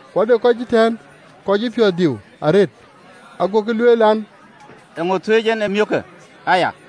Ku ade kɔc ëtɛ̈ɛ̈n kɔc cï piɔ̈ɔ̈th diu arëët, agokï lueel an, “Eeŋö thuëëc en ë miökë aya?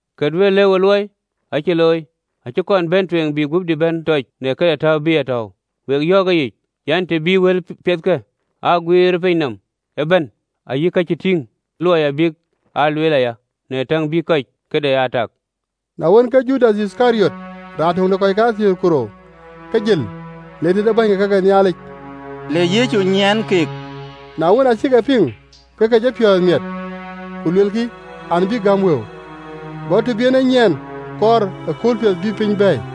Kë duëër lëu ë luɔi acï looi: acï kɔn bɛ̈n tueŋ bï guöpdï bɛ̈n tɔc në këde täu bï a tɔ̈ɔ̈u. Ku wek yɔ̈ɔ̈k ëyic an, të bï wëlpiɛthkë aa guiir ë piny nɔm ëbɛ̈n, ayï kë cïï tiiŋë looi abï aa lueel aya, në täŋ bï kɔc këde aa tak.” Na wën, ke Judath Yithkariɔt, raan töŋ de kɔc kathiëër ku rou, ke jël le tëde bäny ke ka ke Nhialic, le Yecu nyiɛ̈n keek. Na wën, aa cïk e piŋ, ke ke jɔ piɔ̈ɔ̈th miɛt, ku luelkï an, bïk gäm wëu. Go të bï en ë nyiɛɛn kɔɔr ëkööl piɛth bïï piny bɛ̈ɛ̈i.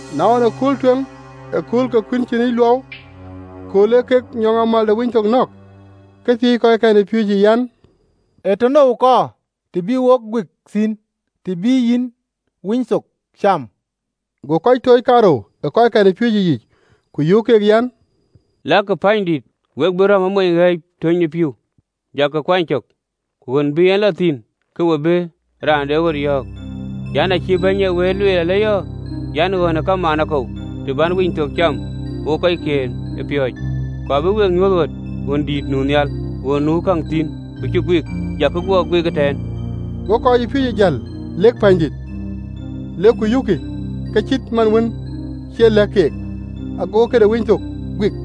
Na ɣɔn, në kööl tueŋ ë akööl ke Dhuëëŋ de Kuïn Cïnic Luɔu, kööl ee kek nyɔŋamääl de Winythok nɔ̈k, ke thiëëc kɔckɛn ë piööcë an, “Ee tënou kɔɔr të bï wok guik thïn, të bï yïn Winythok cam?” Go kɔc tooc kaarou ë kɔckɛn ë piööcë yiic, ku yöök keek an, “Lakï pänydït, ku we bï rɔ̈m ë mony ɣɛ̈ɛ̈c töny ë pïïu: jakï kuany cök, ku ɣön bï en lɔ thïn, ke we bï raan de ɣöt yɔ̈ɔ̈k an, ‘Acï Bɛ̈ny ee wëët lueel alëyɔ̈ɔ̈ an, ɣön ë kamaan akou, të bän Winythok cam wokë kɔckiën ë piööcë?’ Ku abï we nyuöth ɣön dïït nu nhial ɣön nu käŋ thïn ku cï guik: jakï kakuɔ guik ëtɛ̈ɛ̈n.” Go kɔcpiööcë jäl, lek pänydït, lek ku yökkï ke cït man wën cï ë lɛ̈k keek: agokï këde Winythok guik.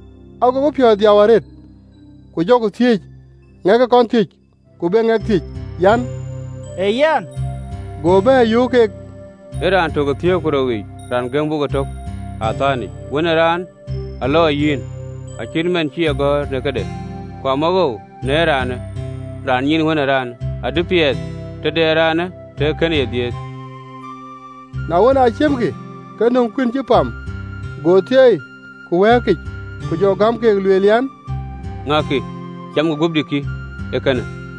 Agokï piɔ̈ɔ̈th dhiau arëët, ku jɔkï thiëëc, ŋɛk ë kɔn thiëc, ku be ŋɛk thiëc an, “Ee yɛn?” Go bɛ̈ɛ̈r, yöök keek an, “Ee raan tök ë thiëër ku rou yiic, raan gëm wok ëtök ë atɛ̈nyic. Wën ë Raan alɔ ëyic, acït man cï e gɔ̈ɔ̈r në këde, ku amawoou në raan nyiin Wën ë Raan! Adï piɛth tëde ë raanë tëë kënë ye dhiëëth!” Na wën, aa ciëmkï, ke nöm kuïn cï pam, go thieei, ku wɛ̈ɛ̈kic, ku jɔ gäm keek, lueel an, “Ŋäkï camkï: guöpdï kï, ee kënë.”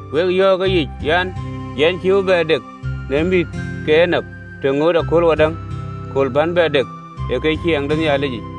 Wek yɔ̈ɔ̈k ëyic an, Yɛn cïï bï bɛ dek në mïth ke enap, të ŋoot ë kööl wadäŋ kööl bän bɛ dek ë ye ë ciɛɛŋ de Nhialic yic.”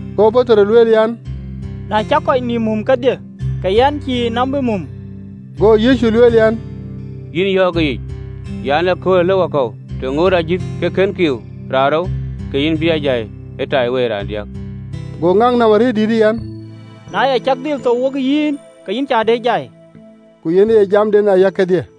Go Petero lueel an, “Na cak kɔc nïïm mum kedhie, ke yɛn cïï nɔm bï mum!” Go Yecu lueel an, “Yïn yɔ̈ɔ̈k ëyic an, ëköölë, ëlë wakɔ̈u, të ŋoot ajïth ke kën kiiu raanrou, ke yïn bï a jai ëtaiwei raandiäk.” Go ŋak nɔm arëët dïïtë an, “Na ya cak dhil thou wokë yïn, ke yïn cä duëër jai!” Ku yen aye jamden aya kedhie.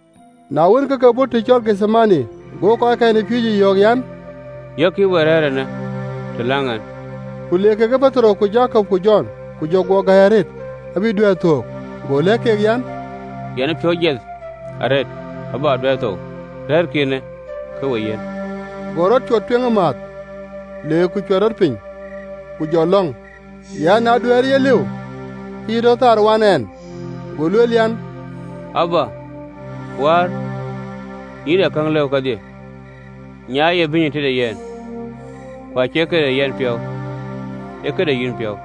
Na wën, ke ke bɔ̈ të cɔl Gethemane: go kɔckɛn ë piööcë yɔ̈ɔ̈k an, “Yɔ̈kkï ë we rɛ̈ɛ̈r eenë, të läŋ ɛn.” Ku le kekë Petero ku Jakop ku Jɔn, ku jɔ guɔ gäi arëët, abï duɛ̈ɛ̈r thöök. Go lɛ̈k keek an, “Yɛn ë piɔ̈u jiɛth arëët, abä duɛ̈ɛ̈r thou: rɛ̈ɛ̈rkï eenë, ke we yiɛ̈n.” Go rɔt cuɔt tueŋ ëmääth, le ku cuɛt rɔt piny, ku jɔ lɔ̈ŋ an, na duɛ̈ɛ̈rë ye lëu, ke yï tɔ thaar wan ɛn. Go lueel an, “Abba, Wäär, yïn ee käŋ lëu kedhie, nyaaiyë bïnyë tëde yɛn: ku acie këde yɛn piɔ̈u, ee këde yïn piɔ̈u.”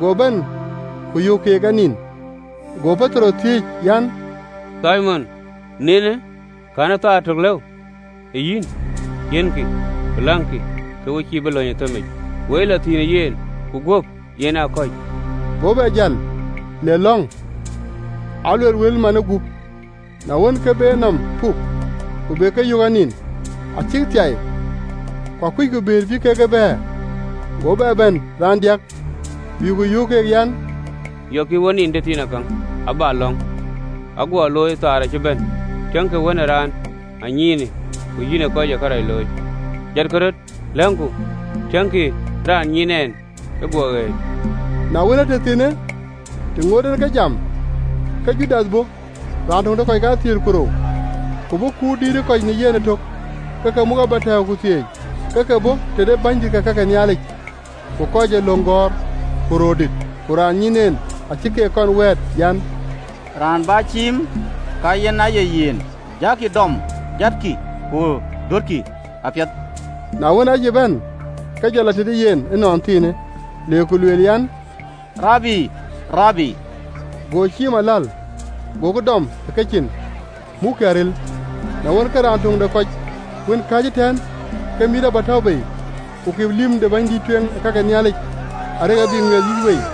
Go bɛ̈n, ku yök keek anin, go Petero thiëëc an, “Thimon, ninë? Cïï thaar tök duëër lëu ë yïn?” Go lëk keek an, “Yiɛ̈nkï, ku läŋkï, ke we cïï bï lɔ ë thëmic: wei ee lɔ thïn ëyic, ku guöp yen kɔ̈c.” Go bɛ jäl, le lɔ̈ŋ, aluel wël manë gup. Na wën, ke be enɔm puk, ku be ke yök anin, acïk thiai, ku akuckï bëër bï kek e bɛ̈ɛ̈r. Go bɛ bɛ̈n raandiäk, bï ku yöök keek an, “Yɔ̈kkï ke we nin tëthiinakäŋ abäk lɔ̈ŋ? Ë guɔ loi! Thaar acï bɛ̈n! Tiëŋkï, Wën ë Raan anyiinë, ku yïnë kɔc ë kërac looi. Jatkï röt, lokku: tiëŋkï, raan nyiin ɛn ë guɔ ɣëët.” Na wën, ëtëthiinë, të ŋoot en ke jam, ke Judath bɔ̈, raan töŋ de kɔc kathiëër ku rou, ku bɔ̈ kut dïït ë kɔc në yen ëtök, ke ke muk abätɛ̈ɛ̈u ku thieec, ke ke bɔ̈ tëde bänydït ke ka ke Nhialic ku kɔc ee löŋ gɔ̈ɔ̈r ku röördït. Ku raan nyiin en acï keek kɔn wɛ̈ɛ̈t an, “Raan bä ciim, ka yen aye yen, jakï dɔm, jatkï, ku dɔ̈tkï apiɛth.” Na wën aa cï bɛ̈n, ke jɔ lɔ tëde yen ënɔnthiinë, le ku lueel an, “Rabi, Rabi!” Go ciim aläl. Gokï dɔm ë kecin, ku mukkï aril. Na wën, ke raan töŋ de kɔc wën kääc ëtɛ̈ɛ̈n, ke mïït abätäu bei, ku kip lïm de bɛ̈nydïït ë kake Nhialic, arëk abï ŋuiɛth yïc wei.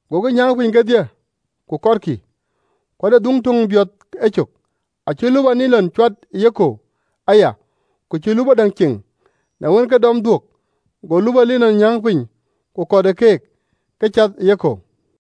Gokï nyääŋ piny kedhie, ku kɔtkï. Ku ade dhuŋ töŋ biɔth ecök, acï lupɔ linɔn cuat ë yekɔ̈u aya, ku cïn lupɔ däŋ ceŋ: na wën, ke dɔm dhuök, go lupɔ linɔn nyääŋ piny, ku kɔt ë keek, ke cath ë yekɔ̈u.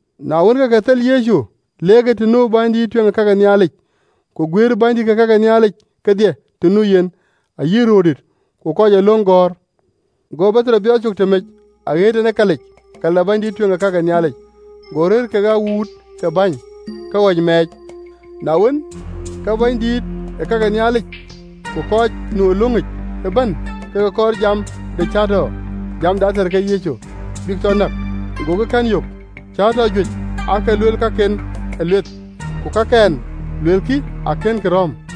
Na wën, ke ke thel Yecu leerkï të nu bɛ̈nydïït ë kake Nhialic: ku guëër bänydït ke ka ke Nhialic kedhie të nu yen, ayï röördït ku kɔc ee löŋ gɔ̈ɔ̈r. Go Petero biɔɔth cök tëmec, aɣëët en ë kalic kal de bɛ̈nydïït ë kake Nhialic, go rëër kekë kɔc ee bäny tiit, ke ɣɔ̈c mac. Na wën, ke bänydït ke ka ke Nhialic ku kɔc nu ë löŋic ëbɛ̈n ke ke kɔɔr jam de cäätɔ jam de ater ke Yecu, bïk tɔ näk, gokï kɛ̈n yök. Cäätɔɔ juëc aake lueel kakɛn ë lueth, ku kakɛn luelkï akënkï rɔ̈m.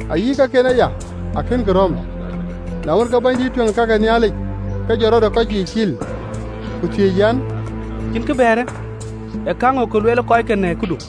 Ayï kaken aya akënkï rɔ̈m. Na wën, ke bɛ̈nydïït ë kake Nhialic ke jɔt rɔt ë kɔc yiic cil, ku thiëëc an, “Cïn kë bɛ̈ɛ̈rë? Ee käŋö kë lueel kɔckë në këdu?”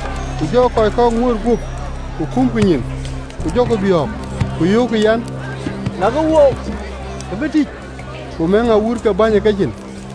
Ku jɔ kɔc kɔ̈k ŋuööt guöp ku kumkï nyin, ku jɔkï biɔ̈ɔ̈k, ku yöökkï an, “lɛ̈kë wook ke bï tïc!” Ku mëëŋ kɔc ee bäny tiit ë kecin.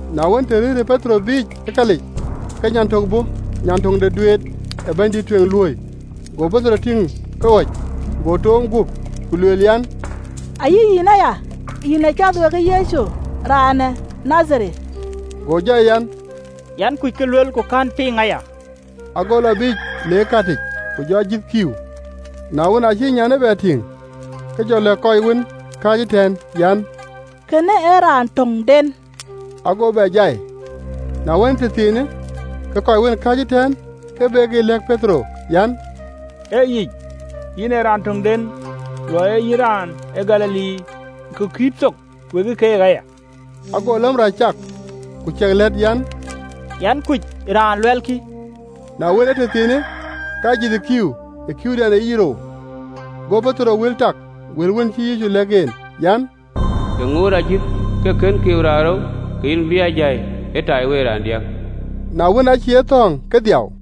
Na wën, të rëërë Petero biic ë kalic, ke nyan tök bɔ̈ nyan töŋ de duet ee bɛ̈nydïït ë kake Nhialic luööi, go Petero tïŋ ke ɣɔ̈c, go toom guöp, ku lueel an, “Ayï yïn aya, yïn ee cath wekë Yecu, raan ë Nadhareth.” Go jai an, “Yɛn kuc kë luel, ku kɛ̈n piŋ aya.” Ago lɔ biic le ë kalic: ku jɔ ajïth kiiu. Na wën, acï nyan lïmë ye bɛ tïŋ, ke jɔ lɛ̈k kɔc wën kääc ëtɛ̈ɛ̈n an, “Kënë ee raan töŋden.” Ago bɛ jai. Na wën, ëtëthiinë, ke kɔc wën kääc ëtɛ̈ɛ̈n ke bekï lɛ̈k Petero an, “Ee yic, yïn ee raan töŋden, luɔi ee yïn raan ë Galili, ku kït thok wekë keek aya.” Ago läm rac cak, ku jɔ kuëëŋ an, “Yɛn kuc raan luɛlkï!” Na wën, ëtëthiinë, ke ajïth ë kiiu ë kiiudɛn ee yic rou. Go Petero wël tak wël wën cïï Yecu lɛ̈k ɛn en an, “Të ŋoot ajïth ke kën kiiu raanrou, ke yïn bï a jai ëtaiwei raandiäk.” Na wën, aacï ye thɔ̈ɔ̈ŋ, ke dhiau.